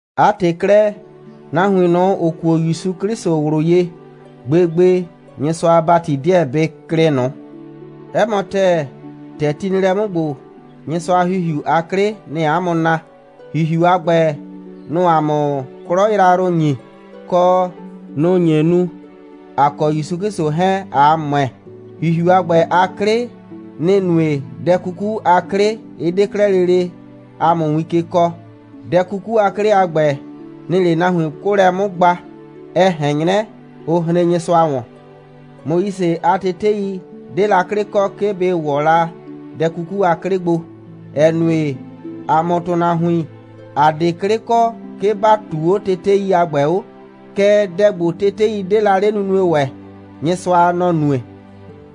'A ‑tɩ 'klɛɛ, nahuin ꞊nʋ, ‑ʋ kuo ‑Yusu 'Klɩsʋ ꞊wlʋ ye, gbegbe Nyɩsʋa a ‑bati 'deɛ bɩ klɩ ꞊nʋ. 'Ɛ mɔ ‑tɛɛ, ‑tɛ ti nɩ lɛ 'mʋ ‑gbo, Nyɩsʋa a ‑Hihiu a 'klɩ, nɩ‑ɩ ‑a mʋ naa. ‑Hihiu a ‑gbɛ, nʋ‑ʋ ‑a mʋ 'klɔ yrayrʋ ‑nyi, kɔ, nʋ‑ nye nu, ‑a kɔ ‑Yusu 'Klɩsʋ 'hɛɛn, ꞊a ‑mʋɛ. ‑Hihiu a ‑gbɛ a 'klɩ, nɩ‑ nue, dɛ 'kuku a 'klɩ 'ɩ 'de 'klɛɛ lele ‑a mʋ win ke kɔɔ. Dɛ 'kuku a 'klɩ a ‑gbɛ, nɩ‑ɩ 'le nahuin 'kʋʋlɛ 'mʋ gba, ɛ ꞊hɛn 'nyrɛ, ʋ hren Nyɩsʋa ‑wɔn. Moise a tetei 'de la 'klɩ kɔ, 'ke bɩ ‑wɔ la dɛ 'kuku a 'klɩ gbo, ‑ɛ nue, ‑a mʋ ‑tʋnahuin, ‑a 'de 'klɩ kɔ, 'ke ‑ba ꞊tuu 'o tetei a ‑gbɛ 'o. Kɛɛ, dɛ ‑gbo, tetei 'de la 'le nunue ‑wɛ, Nyɩsʋa, nɔ‑ nue.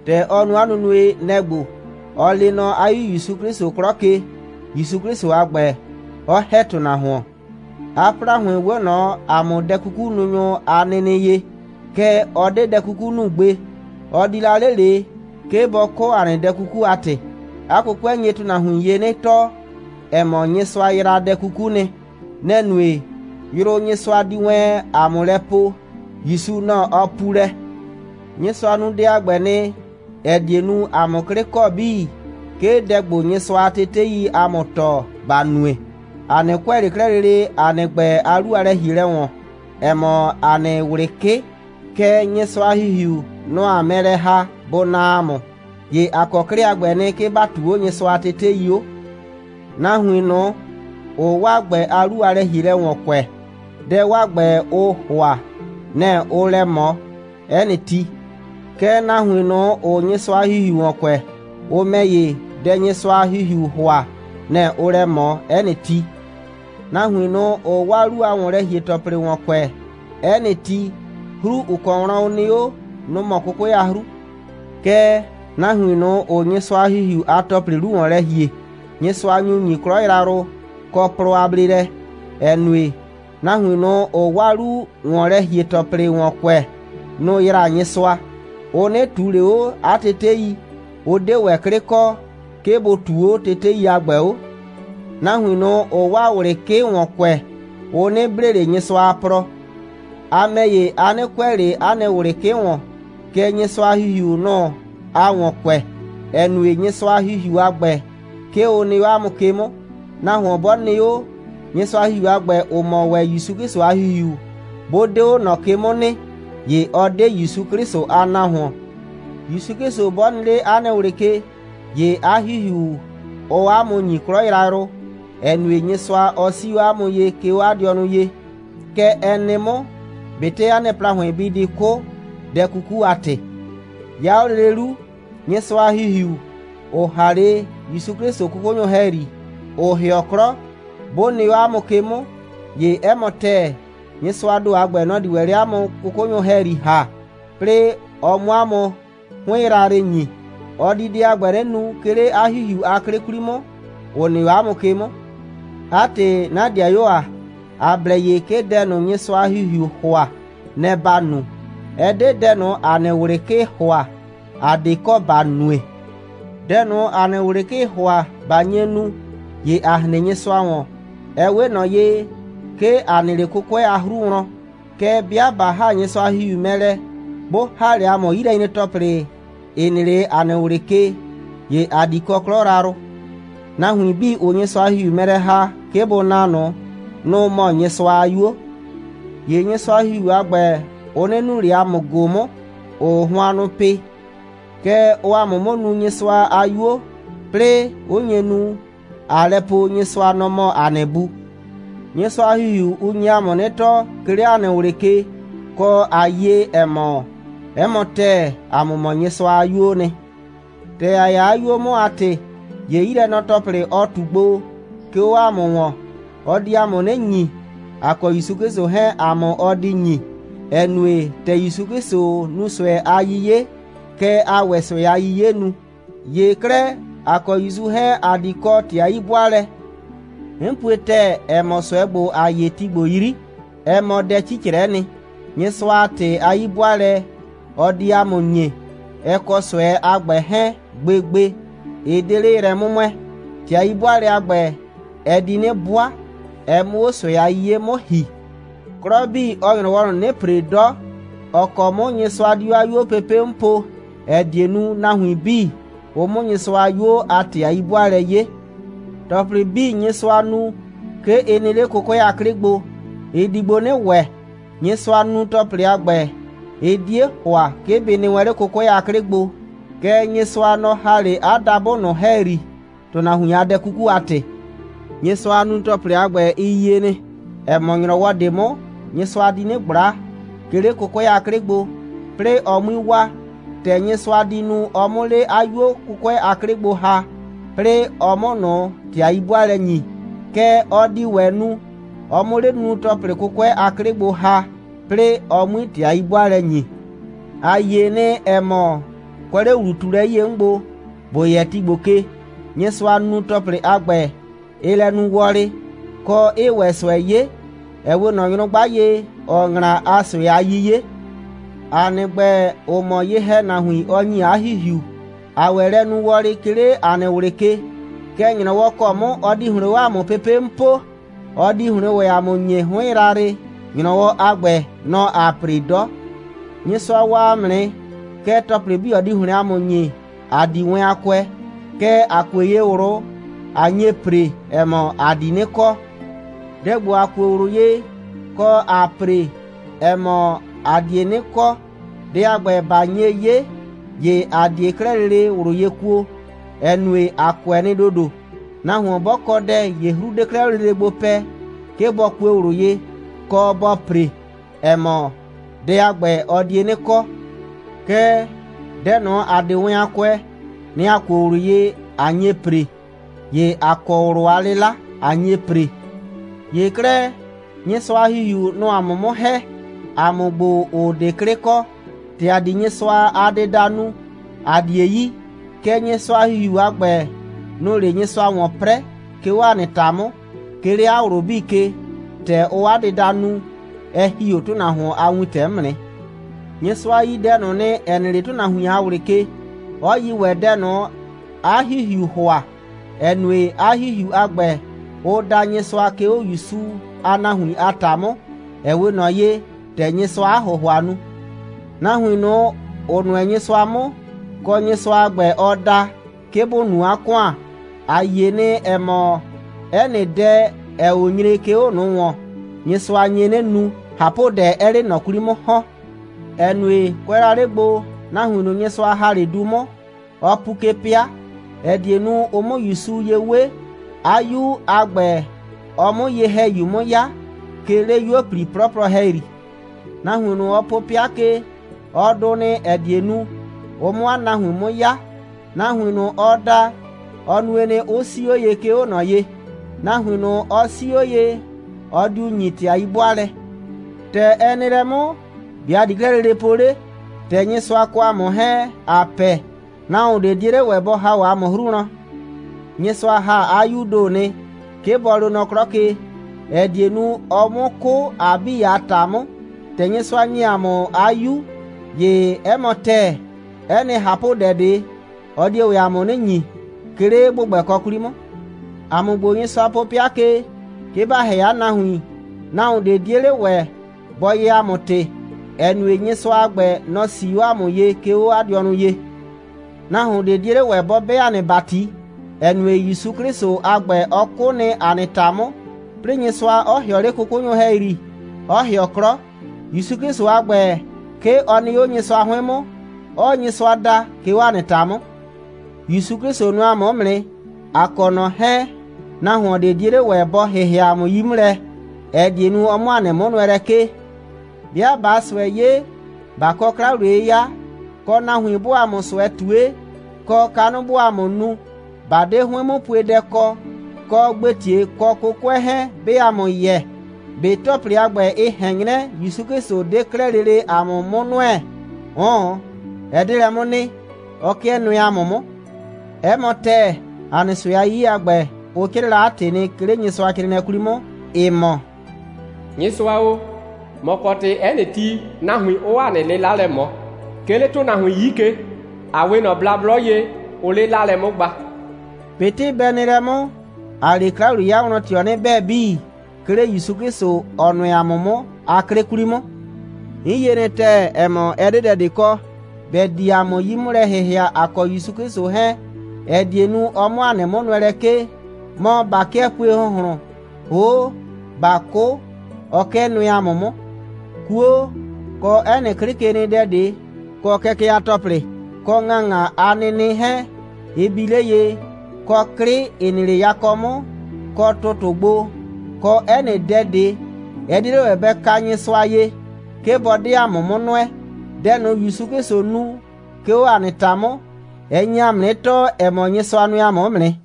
‑Tɛ ɔ nu 'a nunue, nɛ‑ ‑gbo: Ɔ lee nɔ 'a 'Yu ‑Yusu 'Klɩsʋ 'klɔ ke, ‑Yusu 'Klɩsʋ a ‑gbɛ 'ɔ ‑hɛ ‑tʋnahuon. 'A ‑plahʋɩn 'we ꞊nɔ ‑a mʋ dɛ'kukununyʋ a nɩnɩ ye, kɛɛ, ɔ 'de dɛ 'kuku nu gbe. Ɔ di la 'le ꞊le, 'ke bɔ 'kʋ ‑a nɩ dɛ 'kuku a ‑tɩ. 'A 'kʋkʋɛ nye nahuin ye 'nɩ tɔɔ, ‑ɛ mɔ, Nyɩsʋa yraa dɛ 'kuku nɩ. Nɛ‑ nue, yrʋ, Nyɩsʋa di wɛn ‑a mʋ lɛ poo, ‑Yusu, nɔ‑ ɔ puu lɛ. Nyɩsʋa nu dɛ a ‑gbɛ nɩ, ‑ɛ die nu, ‑a 'mʋ 'klɩ kɔ 'bii, 'ke dɛ ‑gbo, Nyɩsʋa a teteii ‑a mʋ tɔɔ, ‑ba nue. ‑A 'nɩ kʋɛ ꞊le 'klɛɛ lele ‑a nɩ ‑gbɛ a 'lu a lɛ‑hielɛ ‑wɔn, ‑ɛ mɔ ‑a nɩ ꞊wlɩ 'kɩ, kɛɛ, Nyɩsʋa a ‑Hihiu, nʋ‑ ‑aa mɛ lɛ ‑ha, bʋ naa ‑a mʋ, ‑ye ‑a kɔ 'klɩ a ‑gbɛ nɩ, 'ke ‑ba ꞊tuu 'o Nyɩsʋa a tetei 'o. Nahuin ꞊nʋ, ‑ʋʋ 'waa ‑gbɛ a 'lu a lɛ‑hielɛ ‑wɔn kʋɛ, dɛ 'waa ‑gbɛ, ʋʋ ‑hʋa, nɛ‑ ʋʋ lɛ ꞊mɔ 'ɛ nɩ ti. Kɛɛ, nahuin ꞊nʋ, ‑ʋʋ Nyɩsʋa a ‑Hihiu ‑wɔn kʋɛ, ʋ ‑mɛ ‑ye, dɛ, Nyɩsʋa a ‑Hihiuu ‑hʋa, nɛ‑ ʋʋ lɛ ꞊mɔ 'ɛ nɩ ti. Nahuin ꞊nʋ, ‑ʋʋ 'waa 'lu a ‑wɔnlɛ‑hie‑tɔplɩ ‑wɔn kʋɛ 'ɛ nɩ ti, 'hru, ‑ʋ kɔ wlɔn ʋ nɩ 'o, nʋ‑ mɔ 'kʋkʋɛ a 'hru. Kɛɛ, nahuin ꞊nʋ, ‑ʋʋ Nyɩsʋa a ‑Hihiu a ‑tɔplɩ 'lu ‑wɔn lɛ ‑hie, Nyɩsʋa nyu ‑nyi 'klɔ yrayrʋ, kɔ plɔ a bleelɛ, ‑ɛ nue, nahuin ꞊nʋ, ‑ʋʋ 'waa 'lu‑wɔnlɛ‑hie‑tɔplɩ ‑wɔn kʋɛ, nʋ‑ yraa Nyɩsʋa. Ʋ 'nɩ ꞊tuu ꞊le 'o 'a tetei. Ʋ 'de ‑wɛ 'klɩ kɔ, 'ke bʋ ꞊tuu 'o tetei a ‑gbɛ 'o. Nahuin ꞊nʋ, ‑ʋʋ 'waa ꞊wlɩ 'kɩ ‑wɔn kʋɛ, ʋ 'nɩ blee ꞊le Nyɩsʋa a plɔ. A ‑mɛ ‑ye, a 'nɩ kʋɛ ꞊le 'a nɩ ꞊wlɩ 'kɩ ‑wɔn, kɛɛ, Nyɩsʋa a ‑Hihiu, nʋ‑ aa ‑wɔn kʋɛ, ‑ɛ nue, Nyɩsʋa a ‑Hihiu a ‑gbɛ, 'ke ʋ nɩ 'o 'a mʋ ke 'mʋ. Nahuon 'bɔ nɩ 'o, Nyɩsʋa a ‑Hihiu a ‑gbɛ, ‑ʋ mɔ ‑wɛ ‑Yusu 'Klɩsʋ a ‑Hihiu, 'bʋ 'de 'o ꞊nɔ ke 'mʋ nɩ, ‑ye ɔ 'de ‑Yusu 'Klɩsʋ a nahuon. ‑Yusu 'Klɩsʋ 'bɔ nɩ 'le 'a nɩ ꞊wlɩ ke, ‑ye 'a ‑Hihiu, ʋʋ 'a mʋ ‑nyi 'klɔ yrayrʋ, ‑ɛ nue, Nyɩsʋa, ɔ 'sii 'o 'a mʋ ye, 'ke 'o 'a dɩɔnʋ ye. Kɛ ɛ nɩ 'mʋ, ꞊betɩ 'a nɩ ‑plahʋɩn bɩ di 'kʋ, dɛ 'kuku a ‑tɩ. 'Ya 'o lele 'lu, Nyɩsʋa a ‑Hihiu, ‑ʋ ‑ha 'le ‑Yusu 'Klɩsʋ 'kʋkʋnyʋ ‑hɛyri, ‑ʋ ‑hɩɔ 'klɔ, 'bʋ nɩ 'o 'a mʋ ke 'mʋ, ‑ye 'ɛ mɔ ‑tɛɛ, Nyɩsʋaa ‑do a ‑gbɛ, nɔ‑ di ‑wɛ 'le 'a mʋ 'kʋkʋnyʋ ‑hɛyri ‑ha, 'plɩɩ ɔ 'mʋ 'a mʋ 'hʋɩn yrayrɩ ‑nyi. Ɔ di dɛ a ‑gbɛ 'nɩ nu, 'ke 'le 'a ‑Hihiu a 'klɩ 'kwli 'mʋ, ‑ʋ nɩ 'o 'a mʋ ke 'mʋ. 'A ‑tɩ, 'na ‑dɩayuo ‑a, ‑a blɛ ye, 'ke dɛ ꞊nʋ, Nyɩsʋa a ‑Hihiuu ‑hʋa, nɛ‑ ‑ba nu. Ɛ 'de dɛ ꞊nʋ, ‑a nɩ ꞊wlɩ 'kɩɩ ‑hʋa, ‑a 'de kɔ ‑ba nue. Dɛ ꞊nʋ, 'a nɩ ꞊wlɩ 'kɩɩ ‑hʋa, 'ba nye nu, ‑ye a hren Nyɩsʋa ‑wɔn, ɛ 'we ꞊nɔ ye, 'ke a nɩ 'le 'kʋkʋɛ a 'hru wlɔn. Kɛɛ, 'bɩa 'ba ‑ha Nyɩsʋa a ‑Hihiu mɛ lɛ, bʋ ‑ha 'le 'yilɛnyre‑tɔplɩ, ‑ɩ nɩ 'le 'a nɩ ꞊wlɩ ke, ‑ye a di kɔ 'klɔ yrayrʋ. Nahuin 'bii, ‑ʋʋ Nyɩsʋa a ‑Hihiu mɛ lɛ ‑ha, 'ke bʋ naa ꞊nʋ, nʋ‑ mɔ Nyɩsʋa a 'yuo. ‑Ye Nyɩsʋa a ‑Hihiu a ‑gbɛ, ʋ 'nɩ nuu ꞊le ‑a mʋ ꞊go 'mʋ, ‑ʋʋ hʋannʋ pɩ, kɛɛ, ʋʋ ‑a mʋ 'mʋ nuu Nyɩsʋa a 'yuo, 'plɩɩ 'ʋ nye nu, ꞊aa lɛ po, Nyɩsʋa, nɔ‑ mɔ ‑a nɩ Bu. Nyɩsʋa a ‑Hihiu, ʋ nye ‑a mʋ 'nɩ tɔɔ, 'ke 'le ‑a nɩ ꞊wlɩ ke, kɔ, ꞊a yie, ‑ɛ mɔ, 'ɛ mɔ ‑tɛɛ, ‑a mʋ mɔ Nyɩsʋa a 'yuoo nɩ. ‑Tɛ ‑a 'ya 'a 'yuo 'mʋ a ‑tɩ, ‑ye 'yilɛnɔ‑tɔplɩ, ɔ ꞊tu gbo, 'ke 'o ‑a mʋ ‑wɔn, ɔ di ‑a mʋ 'nɩ ‑nyi. ‑A kɔ ‑Yusu 'Klɩsʋ 'hɛɛn, ‑a mʋ ɔ di ‑nyi, ‑ɛ nue, ‑tɛ ‑Yusu 'Klɩsʋ nu ꞊sʋɛ a 'yiye, kɛ ‑aa ‑wɛ ꞊sʋɛ a 'yiye nu. ‑Ye 'klɛɛ, ‑a kɔ ‑Yusu 'hɛɛn, ‑a di kɔ ‑tɩ a 'yi'bʋaalɛ. 'N pue ‑tɛɛ, ‑ɛ mɔ, ꞊sʋɛ ‑gbo, ‑aa 'ye ti ‑gbo 'yri, ɛ mɔ dɛ 'cicrɛ'ɛ nɩ. Nyɩsʋa a ‑tɩ a 'yi'bʋaalɛ, ɔ di ‑a mʋ ‑nyi, ɛ kɔ ꞊sʋɛ a ‑gbɛ 'hɛɛn, gbegbe, ɩ 'de 'le yrɛ 'mʋmʋɛɛ. ‑Tɩ a 'yi'bʋaalɛ a ‑gbɛ, ɛ di 'nɩ 'bʋa, ɛ 'mʋ 'o ꞊sʋɛ a 'yiye 'mʋ ‑hi. 'Klɔ 'bii, ɔɔ ‑nyrɔwɔ ꞊nʋ 'nɩ ‑pre 'dɔ, ‑ɔ kɔ 'mʋ Nyɩsʋa di 'o 'a 'yuo pepe' 'mʋ poo, ‑ɛ die nu, nahuin 'bii, ʋ 'mʋ Nyɩsʋa a 'yuo a ‑tɩ a 'yi'bʋaalɛ 'ye. ‑Tɔplɩ 'bii, Nyɩsʋa nu, 'ke ɩ nɩ 'le 'kʋkʋɛ a 'klɩ gbo. Ɩ di gbo 'nɩ ‑wɛ. Nyɩsʋa a nunu‑tɔplɩ a ‑gbɛ, ɩ 'die ‑hʋa, 'ke bɩ nɩ wɛn 'le 'kʋkʋɛ a 'klɩ gbo, kɛɛ, Nyɩsʋa, nɔ‑ ‑ha 'le 'a dabʋ ꞊nʋ ‑hɛyri, ‑tʋnahuin a dɛ 'kuku a ‑tɩ. Nyɩsʋa a nunu‑tɔplɩ a ‑gbɛ, ɩ yie nɩ, ‑ɛ mɔ, ‑nyrɔwɔ ꞊de 'mʋ Nyɩsʋa di 'nɩ ꞊gbla, 'ke 'le 'kʋkʋɛ a 'klɩ gbo, 'plɩɩ ɔ 'mui waa. ‑Tɛ Nyɩsʋa di nu, ɔ 'mʋ 'le 'a 'yuo 'kʋkʋɛ a 'klɩ gbo ‑ha, 'plɩɩ ɔ 'mʋ ꞊nʋ ‑tɩ a 'yi'bʋaalɛ ‑nyi, kɛ ɔ di ‑wɛ nu, ɔ 'mʋ 'le 'a nunu‑tɔplɩ 'kʋkʋɛ a 'klɩ gbo ‑ha, 'plɩɩ ɔ 'mui ‑tɩ a 'yi'bʋaalɛ ‑nyi. ‑A yie nɩ, ‑ɛ mɔ, kʋɛ 'le ‑wlu꞊tuelɛ 'yie 'mʋ gbo, ‑bo yɛ ti ‑gbo ke, Nyɩsʋa a nunu‑tɔplɩ a ‑gbɛ, ɩɩ lɛ nu wɔlɩ, kɔ, 'ɩɩ ‑wɛ ꞊sʋɛ 'ye, ɛ 'we ꞊nɔ nyrʋgba ye, ‑ɔɔ ‑ŋla a ꞊sʋɛ a 'yiye. ‑A nɩ ‑gbɛ, ‑ʋ mɔ ye‑hɛnahuin, ɔ ‑nyi 'a ‑Hihiu, ‑aa ‑wɛ lɛ nu wɔlɩ, 'ke 'le ‑a nɩ ꞊wlɩ ke. Kɛɛ, ‑nyrɔwɔ ‑kɔ 'mʋ ɔ di ‑hlɩn 'o ‑a mʋ pepe' 'mʋ poo, ɔ di ‑hlɩn ‑wɛ ‑a mʋ ‑nyi 'hʋɩn yrayrɩ. ‑Nyrɔwɔ a ‑gbɛ, nɔ‑ ‑aa ‑pre 'dɔ. Nyɩsʋa waa ‑a mʋ nɩ, kɛɛ, ‑tɔplɩ 'bii, ɔ di ‑hlɩn ‑a mʋ ‑nyi, ‑a 'di wɛn a kʋɛ. Kɛɛ, ‑a kue ye ꞊wlʋ, ꞊a nye ‑pre, ‑ɛ mɔ, ‑a di 'nɩ kɔ. Dɛ ‑gbo, ‑a kuo ꞊wlʋ ye, kɔ, ‑aa ‑pre, ‑ɛ mɔ, ‑a die 'nɩ kɔ, dɛ a ‑gbɛ, ꞊ba nye 'ye, ‑ye ‑a 'die 'klɛɛ lele ꞊wlʋ ye kuo, ‑ɛ nue, ‑a kʋɛ nɩ ‑dodo. Nahuon 'bɔ kɔ dɛ, ‑ye 'hru 'de 'klɛɛ lele 'o gbo pɛ, 'ke bɔ kue ꞊wlʋ ye, kɔ bɔ ‑pre, ‑ɛ mɔ, dɛ a ‑gbɛ, ɔ die 'nɩ kɔ. Kɛɛ, dɛ ꞊nʋ, ‑a 'de wɛn a kʋɛ, nɛ‑ ‑a kuo ꞊wlʋ ye, ꞊a nye ‑pre. ‑Ye ‑a kɔ ꞊wlʋ a 'lɩla, ꞊a nye ‑pre. ‑Ye 'klɛɛ, Nyɩsʋa a ‑Hihiu, nʋ‑ʋ ‑a mʋ 'mʋ ‑hɛ, ‑a mʋ ‑gbo, ‑ʋ 'de 'klɩ kɔ. ‑Tɛ ‑a di Nyɩsʋa a dɩda nu, ‑a 'die yi. Kɛɛ, Nyɩsʋa a ‑Hihiu a ‑gbɛ, nʋ‑ʋ 'le Nyɩsʋa ‑wɔn 'prɛɛ, 'ke 'o ‑a nɩ ‑ta 'mʋ, 'ke 'le 'a ꞊wlʋ 'bii ke. ‑Tɛ ʋʋ 'a dɩda nu, ɛ ‑hi 'o ‑tʋnahuon a wintɛ 'mʋ nɩ. Nyɩsʋa yi dɛ ꞊nʋ nɩ, ‑ɛ nɩ 'le ‑tʋnahuin a ꞊wlɩ ke, 'ɔ yi ‑wɛ dɛ ꞊nʋ, 'a ‑Hihiuu ‑hʋa, ‑ɛ nue, 'a ‑Hihiu a ‑gbɛ, ʋʋ da Nyɩsʋa, 'ke 'o ‑Yusu a nahuin a ‑ta 'mʋ, ‑ɛ 'we ꞊nɔ ye, ‑tɛ Nyɩsʋaa 'a ‑hʋhʋa nu. Nahuin ꞊nʋ, ‑ʋ nʋɛ Nyɩsʋa 'mʋ, kɔ, Nyɩsʋa a ‑gbɛ, ɔ da, 'ke bʋ nu 'a ‑kʋan, ‑a yie nɩ, ‑ɛ mɔ, 'ɛ nɩ dɛ, ‑ɛɛ 'o nyre, 'ke 'o ꞊nʋ ‑wɔn, Nyɩsʋa nye 'nɩ nu, ꞊hapʋdɛ 'ɛɛ 'le ꞊nɔ 'kwli 'mʋ ‑hɔn, ‑ɛ nue, kʋɛ la 'le gbo, nahuin ꞊nʋ, Nyɩsʋa ‑ha 'le du 'mʋ, ɔ pu ke 'pɩa, ‑ɛ die nu, ʋ 'mʋ ‑Yusu ye 'we, 'a 'Yu a ‑gbɛ, ɔ 'mʋ Ye‑hɛyu 'mʋ 'ya, 'ke 'le 'yuo꞊pli 'plɔplɔ ‑hɛyri. Nahuin ꞊nʋ, ɔ po 'pɩa ke, ɔ dʋ nɩ, ‑ɛ die nu, ʋ 'mʋ 'a nahuin 'mʋ 'ya. Nahuin ꞊nʋ, ɔ da, ɔ nue nɩ, 'ʋ 'sii 'o ye, 'ke 'o ꞊nɔ ye. Nahuin ꞊nʋ, ɔ 'sii 'o ye, ɔ diu ‑nyi ‑tɩ a 'yi'bʋaalɛ. ‑Tɛ ɛ nɩ lɛ 'mʋ, ‑be' ‑a di 'klɛɛ lele po 'le? ‑Tɛ Nyɩsʋa kɔ ‑a mʋ 'hɛɛn, ‑a pɛ, nahuon ꞊de 'die 'le ‑wɛ bɔ ‑ha 'o ‑a mʋ 'hru wlɔn. Nyɩsʋa ‑ha 'a 'Yuu ‑do nɩ, 'ke bɔ loo nɔ 'klɔ ke, ‑ɛ die nu, ɔ 'mʋ 'kʋ ‑a 'bii a ‑ta 'mʋ. ‑Tɛ Nyɩsʋa ‑nye ‑a mʋ 'a 'Yu, ‑ye 'ɛ mɔ ‑tɛɛ, 'ɛ nɩ ꞊hapʋdɛ ꞊de, ɔ die ‑wɛ ‑a mʋ 'nɩ ‑nyi, 'ke 'le ‑gbʋgbɛkɔ 'kwli 'mʋ. ‑A mʋ ‑gbo, Nyɩsʋa po 'pɩa ke, 'ke ‑ba ‑hɛ 'a nahuin, nahuon ꞊de 'die 'le ‑wɛ bɔ yɛɛ ‑a mʋ ‑tɩ, ‑ɛ nue, Nyɩsʋa a ‑gbɛ, nɔ‑ 'sii 'o ‑a mʋ ye, 'ke 'o 'a dɩɔnʋ ye. Nahuon ꞊de 'die 'le ‑wɛ, bɔ 'bɛ ‑a nɩ ‑bati, ‑ɛ nue, ‑Yusu 'Klɩsʋ a ‑gbɛ, ɔ 'kʋ nɩ ‑a nɩ ‑ta 'mʋ, 'plɩɩ Nyɩsʋa 'ɔ ‑hɩɔ 'le 'kʋkʋnyʋ ‑hɛyri, 'ɔ ‑hɩɔ 'klɔ. ‑Yusu 'Klɩsʋ a ‑gbɛ, 'ke ɔ nɩ 'o Nyɩsʋa 'hʋɩn 'mʋ, 'ɔɔ Nyɩsʋa da, 'ke 'o ‑a nɩ ‑ta 'mʋ. ‑Yusu 'Klɩsʋ nʋɛ ‑a mʋ 'mʋ nɩ. ‑A kɔ ꞊nɔ 'hɛɛn, nahuon ꞊de 'die 'le ‑wɛ, bɔ ‑hɩhɩa ‑a mʋ 'yi 'mʋ lɛ, ‑ɛ die nu, ɔ 'mʋ ‑a nɩ 'mʋnʋɛlɛ 'kee. 'Bɩa ꞊baa ꞊sʋɛ 'ye, ꞊ba kɔ 'kla‑wliye'yɩya, kɔ, nahuin 'bʋʋ ‑a mʋ ꞊sʋɛ ꞊tue, kɔ, kanʋ 'bʋʋ ‑a mʋ nu, ꞊ba 'de 'hʋɩn'mʋpuedɛ kɔ, kɔ, ‑gbetie kɔ 'kʋkʋɛ 'hɛɛn 'bɩɩ ‑a mʋ yɛ, ꞊be ‑tɔplɩ a ‑gbɛ, ɩ ꞊hɛn 'nyrɛ, ‑Yusu 'Klɩsʋ 'de 'klɛɛ lele ‑a mʋ 'mʋ nʋɛ? 'Ʋʋn, ɛ 'de lɛ 'mʋ nɩ. Ɔ 'kɩɛ nʋɛ ‑a mʋ 'mʋ. 'Ɛ mɔ ‑tɛɛ, ‑a nɩ ꞊sʋɛ a 'yiye a ‑gbɛ, ʋ 'crɩɩ la 'a ‑tɩ nɩ, 'ke 'le Nyɩsʋacrɩɩnɩɛ 'kwli 'mʋ, ‑ɩ mɔ: «Nyɩsʋa o, ‑mɔ kɔ ‑tɩ, 'ɛ nɩ ti, nahuin 'ʋʋ ‑a nɩ 'lɩla lɛ ꞊mɔ. 'Ke 'le ‑tʋnahuin 'yi ke, ‑a 'we ꞊nɔ blablɔ ye, ʋʋ 'le 'laalɛ 'mʋ gba.» ꞊Betɩ bɛ nɩ lɛ 'mʋ, ‑aa 'le 'kla‑wliye'yɩya wlɔn ꞊tɩɔ 'nɩ 'bɛɛ 'bii, 'ke 'le ‑Yusu 'Klɩsʋ, ‑ɔ nʋɛ ‑a mʋ 'mʋ a 'klɩ 'kwli 'mʋ. 'N yie nɩ ‑tɛɛ, ‑ɛ mɔ, ɛ 'de dɛ ꞊de kɔ, ‑bɛ di ‑a mʋ 'yi 'mʋ lɛ ‑hɩhɩa, ‑a kɔ ‑Yusu 'Klɩsʋ 'hɛɛn, ‑ɛ die nu, ɔ 'mʋ ‑a nɩ 'mʋnʋɛlɛ 'kee. Mɔ, ꞊ba 'kɩɛ pue ‑hʋnhlʋn, ‑hoo' ꞊baa 'kʋ, ɔ 'kɩɛ nʋɛ ‑a mʋ 'mʋ. 'Kuo, kɔ 'ɛ nɩ 'klɩkenɩdɛ ꞊de, kɔ kɛkɛ a ‑tɔplɩ kɔ ‑ŋaŋa a nɩnɩ 'hɛɛn, ɩ bi 'le ye, kɔ 'klɩ, ‑ɩ nɩ 'le yakɔ 'mʋ kɔ ‑tʋtʋ gbo, kɔ 'ɛ nɩ dɛ ꞊de, ɛ 'die 'le ‑wɛ bɛ ka Nyɩsʋa ye, 'ke bɔ 'de ‑a mʋ 'mʋ nʋɛ. Dɛ ꞊nʋ, ‑Yusu 'Klɩsʋ nu, 'ke 'o ‑a nɩ ‑ta 'mʋ, ɛ nye ‑a mʋ 'nɩ tɔɔ, ‑ɛ mɔ, Nyɩsʋa nʋɛ ‑a mʋ 'mʋ nɩ.